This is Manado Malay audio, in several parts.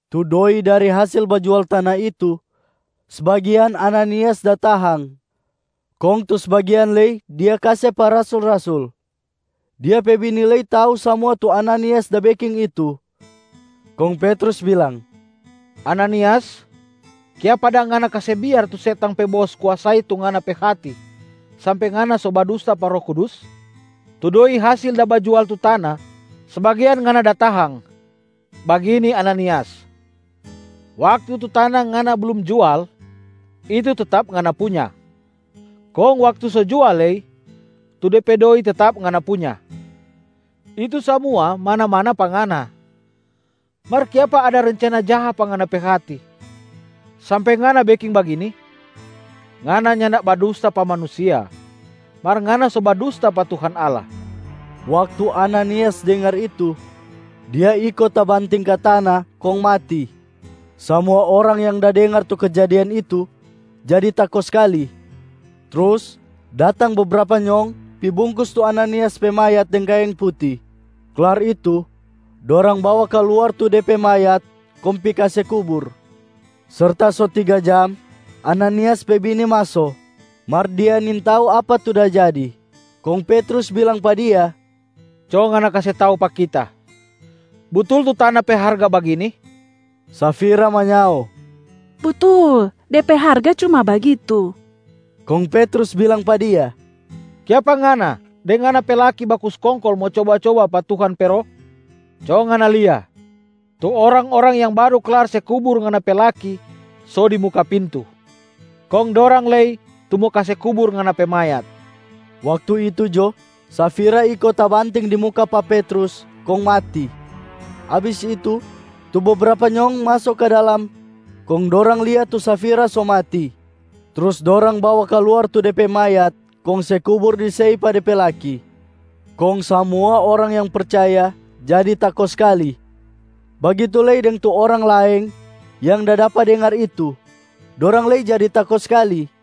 Tu doi dari hasil bajual tana itu, sbagian Ananias da tahang, kong tu sbagian lei dia kase pa rasul-rasul. Dia pe bini lei tau samua tu Ananias da beking itu. Kong Petrus bilang, “Ananias, kiapa dang ngana kase biar tu setang pe bos kuasai tu ngana pe hati, sampe ngana so badusta pa Roh Kudus? Tu doi hasil da bajual tu tana, sbagian ngana da tahang. Bagini Ananias, waktu tu tana ngana blum jual, itu tetap ngana punya. Kong waktu so jual lei, tu de pe doi tetap ngana punya, itu samua mana-mana pa ngana. Mar kiapa ada rencana jaha pa ngana pe hati, sampe ngana beking bagini? Ngana nyanda badusta pa manusia, mar ngana so badusta pa Tuhan Allah.” Waktu Ananias dengar itu, dia iko tabanting ka tana kong mati. Samua orang yang da dengar tu kejadian itu jadi tako skali. Trus datang bebrapa nyong pi bungkus tu Ananias pe mayat deng kaeng puti, klar itu dorang bawa kaluar tu de pe mayat kong pi kase kubur. Serta so tiga jam, Ananias pe bini maso, mar dia nintau apa tu da jadi. Kong Petrus bilang pa dia, “Co ngana kase tau pa kita. Butul tu tana pe harga bagini?” Safira manyao, “Butul, de pe harga cuma bagitu.” Kong Petrus bilang pa dia, “Kiapa ngana deng ngana pe laki baku skongkol mo coba-coba pa Tuhan pe Roh? Co ngana lia, tu orang-orang yang baru klar se kubur ngana pe laki so di muka pintu, kong dorang lei tu mo kase kubur ngana pe mayat.” Waktu itu jo Safira iko tabanting di muka pa Petrus kong mati. Abis itu, tu bebrapa nyong maso ka dalam kong dorang lia tu Safira so mati. Trus dorang bawa kaluar tu de pe mayat kong se kubur di sei pa de pe laki. Kong samua orang yang percaya jadi tako skali. Bagitu lei deng tu orang laeng yang da dapa dengar itu, dorang lei jadi tako skali.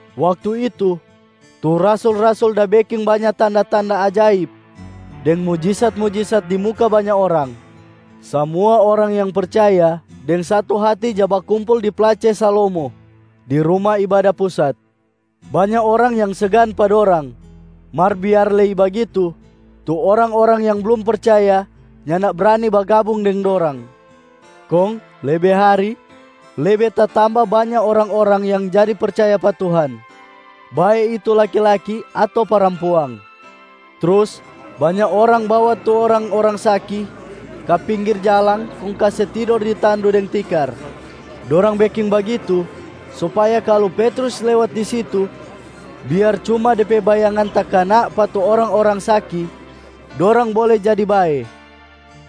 Waktu itu, tu rasul-rasul da beking banya tanda-tanda ajaib deng mujisat-mujisat di muka banya orang. Samua orang yang percaya deng satu hati ja bakumpul di Place Salomo di Ruma Ibada Pusat. Banya orang yang segan pa dorang, mar biar lei bagitu, tu orang-orang yang blum percaya nyanda brani bagabung deng dorang. Kong lebe hari lebe tatamba banya orang-orang yang jadi percaya pa Tuhan, bae itu laki-laki ato parampuang. Trus banya orang bawa tu orang-orang saki ka pinggir jalang kong kase tidor di tandu deng tikar. Dorang beking bagitu supaya kalu Petrus lewat di situ, biar cuma de pe bayangan takana pa tu orang-orang saki, dorang bole jadi bae.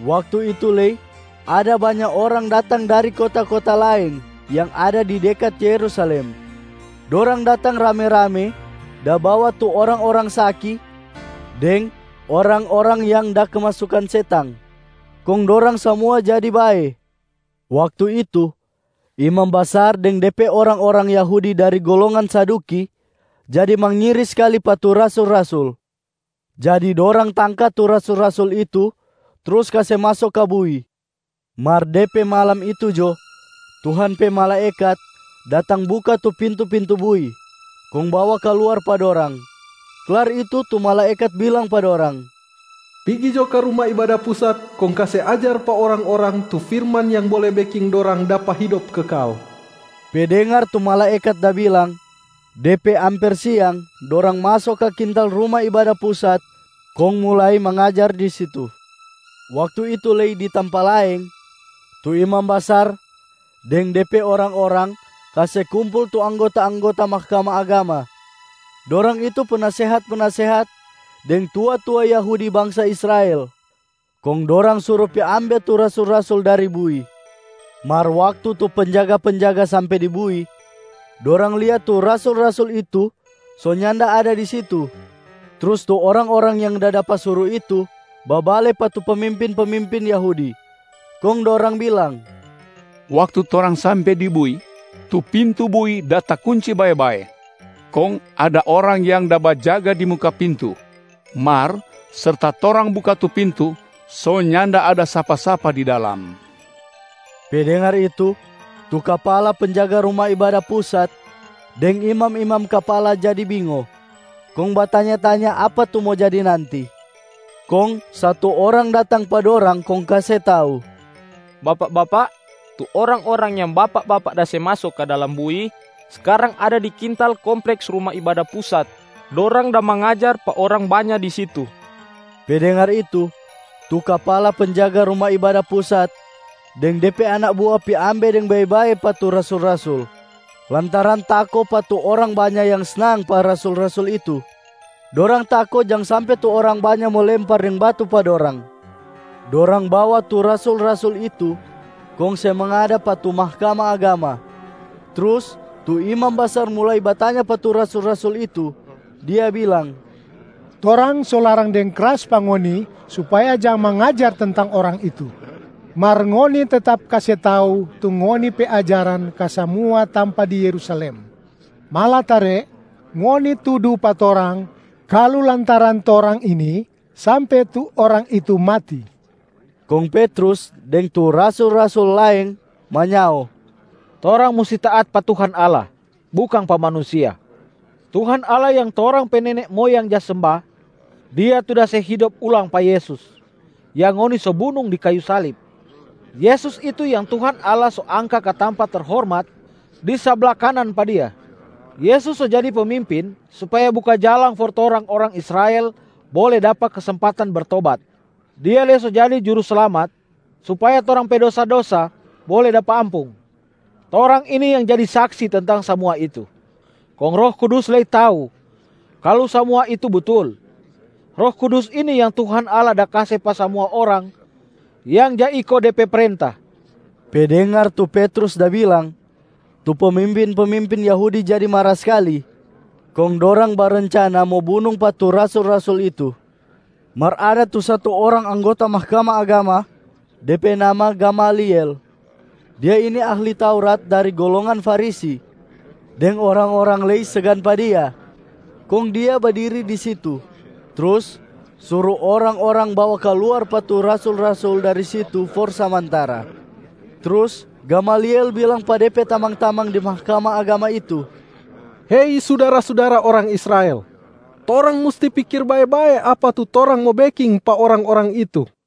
Waktu itu lei ada banya orang datang dari kota-kota laeng yang ada di dekat Yerusalem. Dorang datang rame-rame da bawa tu orang-orang saki deng orang-orang yang da kemasukan setang, kong dorang samua jadi bae. Waktu itu, imam basar deng de pe orang-orang Yahudi dari golongan Saduki jadi mangiri skali pa tu rasul-rasul. Jadi dorang tangka tu rasul-rasul itu trus kase maso ka bui. Mar de pe malam itu jo, Tuhan pe malaekat datang buka tu pintu-pintu bui, kong bawa kaluar pa dorang. Klar itu tu malaekat bilang pa dorang, “Pigi jo ka Ruma Ibada Pusat kong kase ajar pa orang-orang tu firman yang bole beking dorang dapa hidop kekal.” Pe dengar tu malaekat da bilang, de pe amper siang dorang maso ka kintal Ruma Ibada Pusat kong mulai mangajar di situ. Waktu itu lei di tampa laeng, tu imam basar deng de pe orang-orang kase kumpul tu anggota-anggota Mahkamah Agama. Dorang itu penasehat-penasehat deng tua-tua Yahudi bangsa Israel. Kong dorang suru pi ambe tu rasul-rasul dari bui. Mar waktu tu penjaga-penjaga sampe di bui, dorang lia tu rasul-rasul itu so nyanda ada di situ. Trus tu orang-orang yang da dapa suru itu babale pa tu pemimpin-pemimpin Yahudi. Kong dorang bilang, “Waktu torang sampe di bui, tu pintu bui da takunci bae-bae, kong ada orang yang da bajaga di muka pintu. Mar serta torang buka tu pintu, so nyanda ada sapa-sapa di dalam.” Pe dengar itu, tu kapala penjaga Ruma Ibada Pusat deng imam-imam kapala jadi bingo kong batanya-tanya apa tu mo jadi nanti. Kong satu orang datang pa dorang kong kase tau, “Bapak-bapak, tu orang-orang yang bapak-bapak da se maso ka dalam bui, skarang ada di kintal kompleks Ruma Ibada Pusat. Dorang da mangajar pa orang banya di situ.” Pe dengar itu, tu kapala penjaga Ruma Ibada Pusat deng de pe anak bua pi ambe deng bae-bae pa tu rasul-rasul lantaran tako pa tu orang banya yang snang pa rasul-rasul itu. Dorang tako jang sampe tu orang banya mo lempar deng batu pa dorang. Dorang bawa tu rasul-rasul itu kong se mangada pa tu Mahkamah Agama. Trus tu imam basar mulai batanya pa tu rasul-rasul itu, dia bilang, “Torang so larang deng kras pa ngoni supaya jang mangajar tentang Orang itu, mar ngoni tetap kase tau tu ngoni pe ajaran ka samua tampa di Yerusalem. Malatare, ngoni tudu pa torang kalu lantaran torang ini sampe tu Orang itu mati.” Kong Petrus deng tu rasul-rasul laeng manyao, “Torang musti taat pa Tuhan Allah, bukang pa manusia. Tuhan Allah yang torang pe nene moyang ja semba, Dia tu da se hidop ulang pa Yesus, yang ngoni so bunung di kayu salib. Yesus itu yang Tuhan Allah so angka ka tampa terhormat di sabla kanan pa Dia. Yesus so jadi Pemimpin supaya buka jalang for torang orang Israel bole dapa kesempatan bertobat, Dia lei so jadi Juruslamat supaya torang pe dosa-dosa bole dapa ampung. Torang ini yang jadi saksi tentang samua itu, kong Roh Kudus lei tau kalu samua itu butul. Roh Kudus ini yang Tuhan Allah da kase pa samua orang yang ja iko De pe prenta.” Pe dengar tu Petrus da bilang, tu pemimpin-pemimpin Yahudi jadi mara skali, kong dorang barencana mo bunung pa tu rasul-rasul itu. Mar ada tu satu orang anggota Mahkamah Agama, de pe nama Gamaliel. Dia ini ahli Taurat dari golongan Farisi, deng orang-orang lei segan pa dia. Kong dia badiri di situ, trus suru orang-orang bawa kaluar pa tu rasul-rasul dari situ for samantara. Trus Gamaliel bilang pa de pe tamang-tamang di Mahkamah Agama itu, “Hei sudara-sudara orang Israel, torang musti pikir bae-bae apa tu torang mo beking pa orang-orang itu.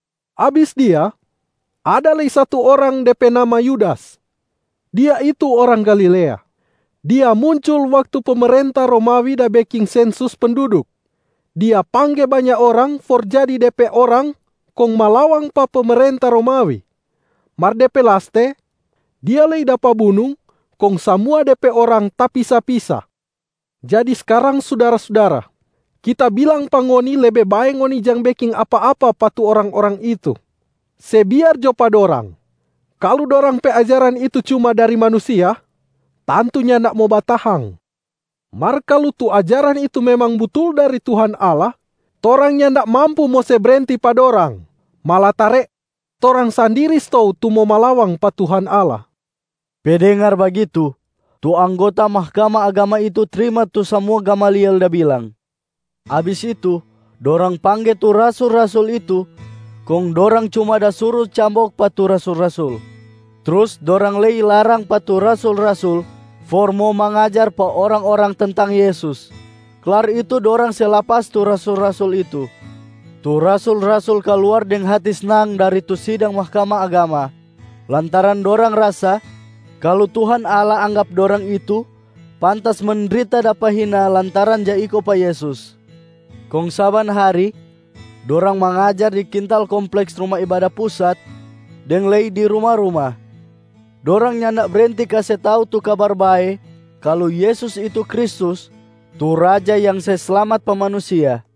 Abis dia, ada lei satu orang de pe nama Yudas. Dia itu orang Galilea. Dia muncul waktu pemerenta Romawi da beking sensus penduduk. Dia pangge banya orang for jadi de pe orang kong malawang pa pemerenta Romawi. Mar de pe laste, dia lei dapa bunung kong samua de pe orang tapisa-pisa. Jadi skarang sudara-sudara, kita bilang pa ngoni lebe bae ngoni jang beking apa-apa pa tu orang-orang itu. Se biar jo pa dorang. Kalu dorang pe ajaran itu cuma dari manusia, tantu nyanda mo batahang. Mar kalu tu ajaran itu memang butul dari Tuhan Allah, torang nyanda mampu mo se brenti pa dorang, malatare torang sandiri stou tu mo malawang pa Tuhan Allah.” Pe dengar bagitu, tu anggota Mahkamah Agama itu trima tu samua Gamaliel da bilang. Abis itu, dorang pangge tu rasul-rasul itu kong dorang cuma da suru cambok pa tu rasul-rasul. Trus dorang lei larang pa tu rasul-rasul for mo mangajar pa orang-orang tentang Yesus. Klar itu dorang se lapas tu rasul-rasul itu. Tu rasul-rasul kaluar deng hati snang dari tu sidang Mahkamah Agama, lantaran dorang rasa kalu Tuhan Allah anggap dorang itu pantas mendrita dapa hina lantaran ja iko pa Yesus. Kong saban hari dorang mangajar di kintal kompleks Ruma Ibada Pusat deng lei di ruma-ruma. Dorang nyanda brenti kase tau tu Kabar Bae kalu Yesus itu Kristus tu Raja yang se slamat pa manusia.